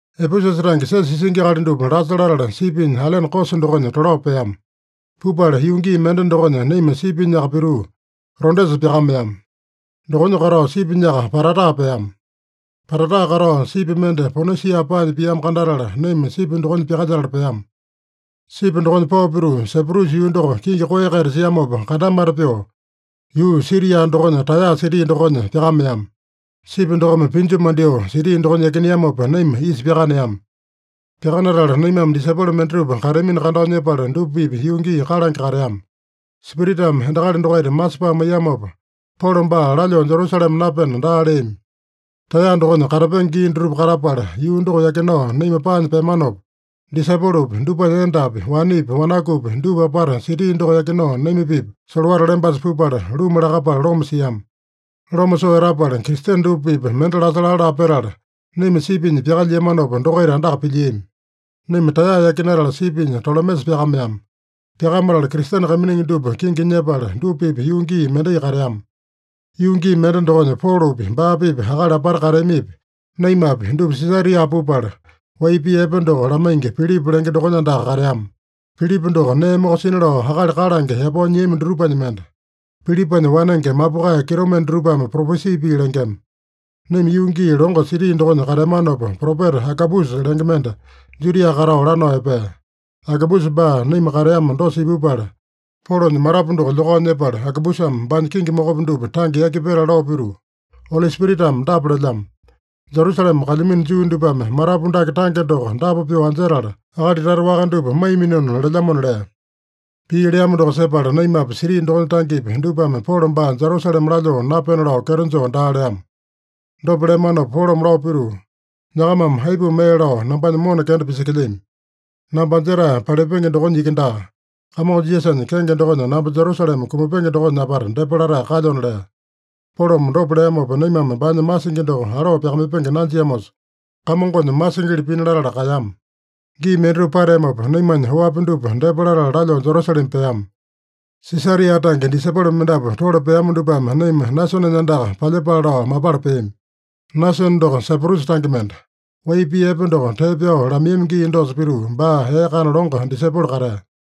Epesusa tange siosa isingi akali dupa lasa latala sipinya ailene Kosa dokonya tolao peama. Pupala yuu gii mende dokonya naima sipinyaka pituu Rodesa pyakameama. Dokonya katao sipinyaka Patara peama. Patara katao sipi mende Ponisia paanya piamo kandatala, naima sipi dokonya pyakalyetala peama. Sipi dokonya pao pituu, Saiprusa yuu doko kingi koeya-kaita siamopa kandamata pyoo, yuu Siria dokonya Taeya siti dokonya pyakameama. Sipi dokome pinju mandyoo siti dokonya yakineamopa, naima isa pyakaneama. Pyakanatala naimame disaipolo mendatupa kateamino kandao nyepala, dupa-pipa yuu gii kalange kateama. Spiritame endakali dokaita masepae maiyamopa, Polo baa lalyoo Jerusalema napena daa leami. Taeya dokonya katapenge gii dutupa katapala, yuu doko yakinao naima paanya peamanopa, disaipolopi, dupanya endapi, wanepi, wanakupi, dupa apata siti doko yakinao naima-pipa solowata lembasa pupala, luma lakapala loma siama. Loma soo etapala, Kristene dupa-pipa mende lasa laa-laa petala, naima sipinya pyakalyiamanopa, dokaita andaka pilyiami. Naima Taeya yakinatala, sipinya Tolemesa pyakameama. Pyakamatala Kristene kaiminingi dupa kingi nyepala, dupa-pipa yuu gii mendai kateama. Yuu gii mende dokonya, Polopi, baa-pipa akali apata kateamipi, naimapi dupa Sisaria pupala, wai pii epe doko lamaingi, Pilipa lenge dokonya andaka kateama. Pilipa doko nee mokosina lao akali kalange yapao nyiami dutupanya mende. (Pilipanya wanenge mapukae kitomende dutupame propesi pii lengema.) Naima yuu gii longo siti dokonya kateamanopa, propeta Agabusa lenge mende Judia katao lanao epea. Agabusa baa naima kateama dosa ipupala, Polonya matapu doko lyokao nyepala, Agabusame baanya kingi mokopi dupa tange yaki petala lao pituu, “Oli Spiritame dapa lelyamo: ‘Jerusalema kalyamino Juu dupame matapu dake tange doko dapa pyoo anjetala, akali tata waka dupa maiyaminona’ lelyamona” lea. Pii leamo doko sepala naimapi, siti dokonya tangepi, dupame Polo baa Jerusalema lalyoo napena lao kyeto joo daa leama. Dopa leamanopa Polome lao pituu, “Nyakamame aipuma ee lao nambanya mona kenda pisekelyami? Namba anjetae palipenge dokonya iki daa, Kamongo Jisasanya kenge dokonya namba Jerusalema kumapenge dokonya apata depa latae kalyona” lea. Polome dopa leamopa, naimame baanya masingi doko aloo pisakamaipenge nanjiamosa, Kamongonya masingili pina latala kaeyama. Gii mendatupa pateamopa, naimanya oapi dupa depa latala lalyoo Jerusalema peama. Sisaria tange disaipolo mendapu tole peama dupame naima Nasonenya andaka palyepale lao mapala peami. Nasone doko Saiprusa tange mende. Wai pii epe doko tee pyao lamaiyami gii dosa pituu, baa ee kana longo disaipolo katea.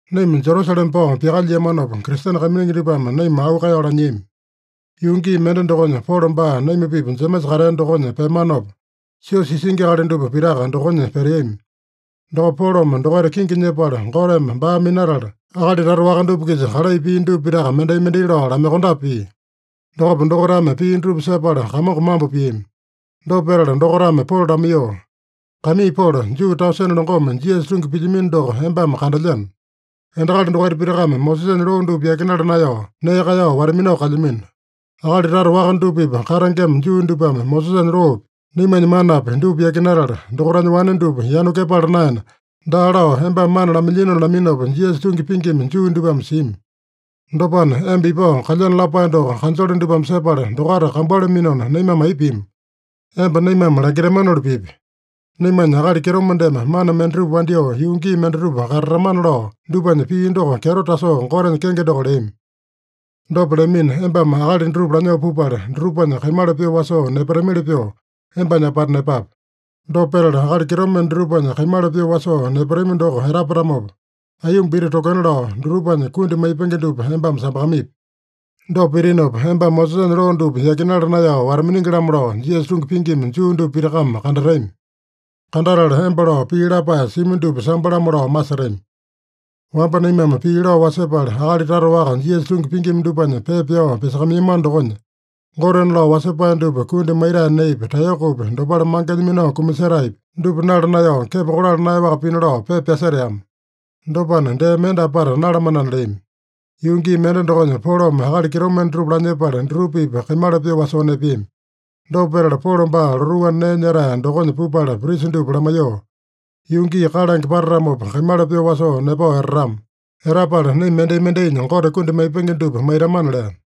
Naima Jerusalema pao pyakalyiamanopa, Kristene kaiminingi dupame naima auu kaeyao lanyiami. Yuu gii mende dokonya, Polo baa naima-pipa Jemesa katea dokonya peamanopa, siosa isingi akali dupa pitaka dokonya peteami. Dokopa Polome dokaita kingi nyepala, Goteme baa minatala, akali tata waka dupa-kisa kalai pia dupa pitaka mendai-mendai lao lamaiyokondape pia. Dokopa dokaitame pii dutupa sepala Kamongo mambo piami. Dopa petala dokaitame Polo lamaiyoo, “Kaimii Polo, Juu tausene longome Jisasa tungi pilyamino doko embame kandelyeno. Endakali dokaita pitakame Mosesanya loo dupa yakinala naeyao, nee kaeyao wata-minao kalyamino. Akali tata waka dupa-pipa katengema Juu dupame Mosesanya loopi, naimanya manapi dupa yakinatala, dokaitanya wane dupa yanu kepala naena, daa lao embame mana lamailyinona laminopa, Jisasa tungi pingima Juu dupame simi. Dopana, emba ipao kalyeno lapae doko kanjole dupame sepala dokaita kambualaminona, naimame aipa pima? Emba naimame langitamanoli pipi. Naimanya akali kitomendeme mana mendatupa wandyoo yuu gii mendatupa katatamana lao dupanya pii doko kyeto tasoo Gotenya kenge doko leami. Dopa leamina, embame akali dutupa lanyoo pupala, dutupanya kaimala pyoo wasoo nepatamili pyoo embanya apata nepape. Dopa petala, akali kitomende dutupanya kaimala pyoo wasoo nepatami doko etapatamopa, aiyomba iti tokena lao, dutupanya kundi maipenge dupa embame sambakamaipi. Dopa pitinopa, embame Mosesanya loo dupa yakinala naeyao wata-miningi-lamo lao Jisasa tungi pingima Juu dupa pitakame kandatami. Kandatala emba lao pii lapae simi dupa sambo-lamo lao masetami. Wamba naimame pii lao wasepala, akali tata waka Jisasa tungi pingima dupanya pepa pyao pyasakamaiyamano dokonya, gotena lao wasepae dupa kundi maitae neepi, taeyokopi, dopale mangenya minao kumasetaepi, dupa nala naeyao, kepo kolala naeyaowaka pina lao pepa pyaseteama. Dopana, dee mende apata nalamanana” leami. Yuu gii mende dokonya Polome akali kitomende dutupa lanyepala, dutupa-pipa kaimala pyoo wasoo nepeami. Dopa petala, Polo baa lotuu anda nee nyetae dokonya pupala prisa dupa lamaiyoo, “Yuu gii kalange patatamopa, kaimala pyoo wasoo nepao etatama. Etapala, naima mendai-mendainya Gote kundi maipenge dupa maitamana” lea.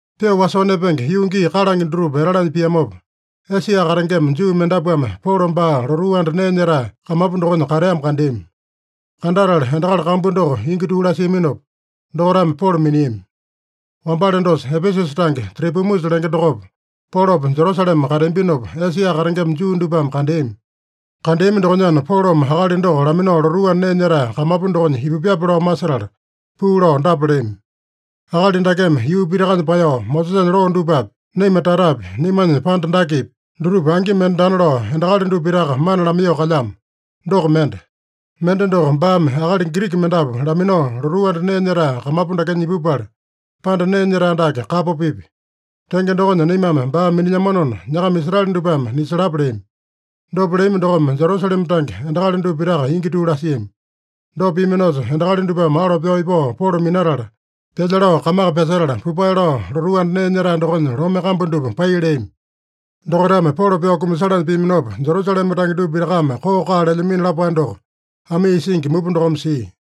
Pyoo wasoo nepenge yuu gii kalange dutupa etalanya piamopa, Esia katengema Juu mendapuame Polo baa lotuu anda nee nyetae kamapu dokonya kateamo kandeami. Kandatala endakali kambu doko ingi tuu lasiaminopa, dokaitame Polo miniami. Wambale dosa, Epesusa tange Tropimusa lenge dokopa, Polopa Jerusalema kateambinopa, Esia katengema Juu dupame kandeami. Kandeami dokonyana, Polome akali doko laminao lotuu anda nee nyetae kamapu dokonya ipupyape lao masetala puu lao dapa leami: “Akali dakeme yuu pitakanya paeyao, Mosesanya loo dupapi, naima tatapi, naimanya panda dakepi, dutupa angi mende daana lao, endakali dupa pitaka mana lamaiyoo kalyamo. Doko mende. Mende doko, baame akali Giriki mendapu laminao, lotuu anda nee nyetae kamapu dakenya ipupala, panda nee nyetae dake kapo pipya. Tenge dokonya, naimame baa minilyamanona, nyakama Israele dupame nisalapa!” leami. Dopa leami dokome Jerusalema tange endakali dupa pitaka ingi tuu lasiami. Dopa piaminosa, endakali dupame alo pyao ipao Polo minatala, pyalya lao kamaka pyasetala, pupae lao lotuu anda nee nyetae dokonya lome kambu dupa pai leami. Dokaitame Polo pyao kumasalanya piaminopa, Jerusalema tange dupa pitakame koo-kaa lelyamino lapae doko amii isingi mupa dokome sia.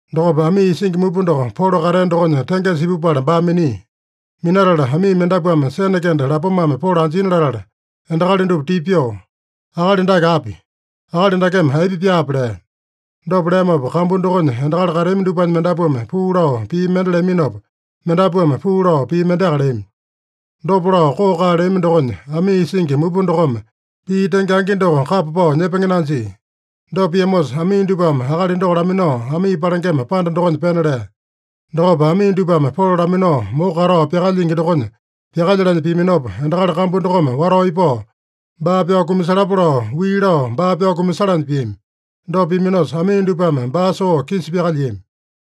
Dokopa amii isingi mupa doko Polo katea dokonya tengesa ipupala baa minia. Minatala, amii mendapuame sene kende lapomame Polo anjina latala, endakali dupa tipa pyoo, “Akali dake api? Akali dakeme aipa pyaape?” lea. Dopa leamopa, kambu dokonya endakali kateami dupanya mendapuame puu lao pii mende leaminopa, mendapuame puu lao pii mendeaka leami. Dopa lao koo-kaa leami dokonya, amii isingi mupa dokome pii tenge angi doko kapa pao nyepenge nanjia. Dopa piamosa, amii dupame akali doko laminao amii palengema panda dokonya pena lea. Dokopa amii dupame Polo laminao moko katao pyakalyingi dokonya pyakalyalanya piaminopa, endakali kambu dokome watao ipao, “Baa pyao kumasalapa” lao wii lao, baa pyao kumasalanya piami. Dopa piaminosa, amii dupame baa soo kisa pyakalyiami.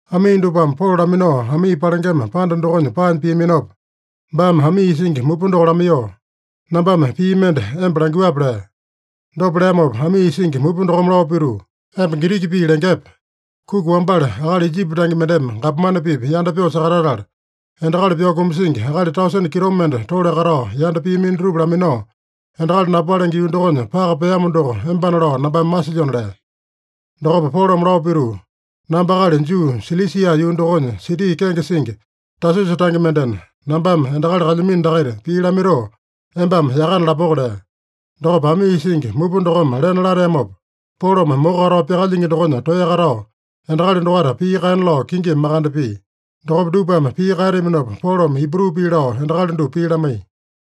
Amii dupame Polo laminao amii palengema panda dokonya paanya piaminopa, baame amii isingi mupa doko lamaiyoo, “Nambame pii mende emba langyuape?” lea. Dopa leamopa amii isingi mupa dokome lao pituu, “Emba Giriki pii lengepe? Kuki wambale akali Ijipi tange mendeme gapomane-pipa yanda pyoo sakatatala, endakali pyao kumasingi akali tausene kitomende tole katao yanda piamino dutupa laminao, endakali napalenge yuu dokonya paka peamo doko embana lao nambame masilyona” lea. Dokopa Polome lao pituu, “Namba akali Juu, Silisia yuu dokonya, siti kenge singi Tasusa tange mendena, nambame endakali kalyamino dakaita pii lamaitoo, embame yakana lapoko” lea. Dokopa amii isingi mupa dokome lena lateamopa, Polome moko katao pyakalyingi dokonya toeya katao, endakali dokaita pii kaena lao kingimi makande pia. Dokopa dupame pii kaeteaminopa, Polome Ibru pii lao endakali dupa pii lamaiya.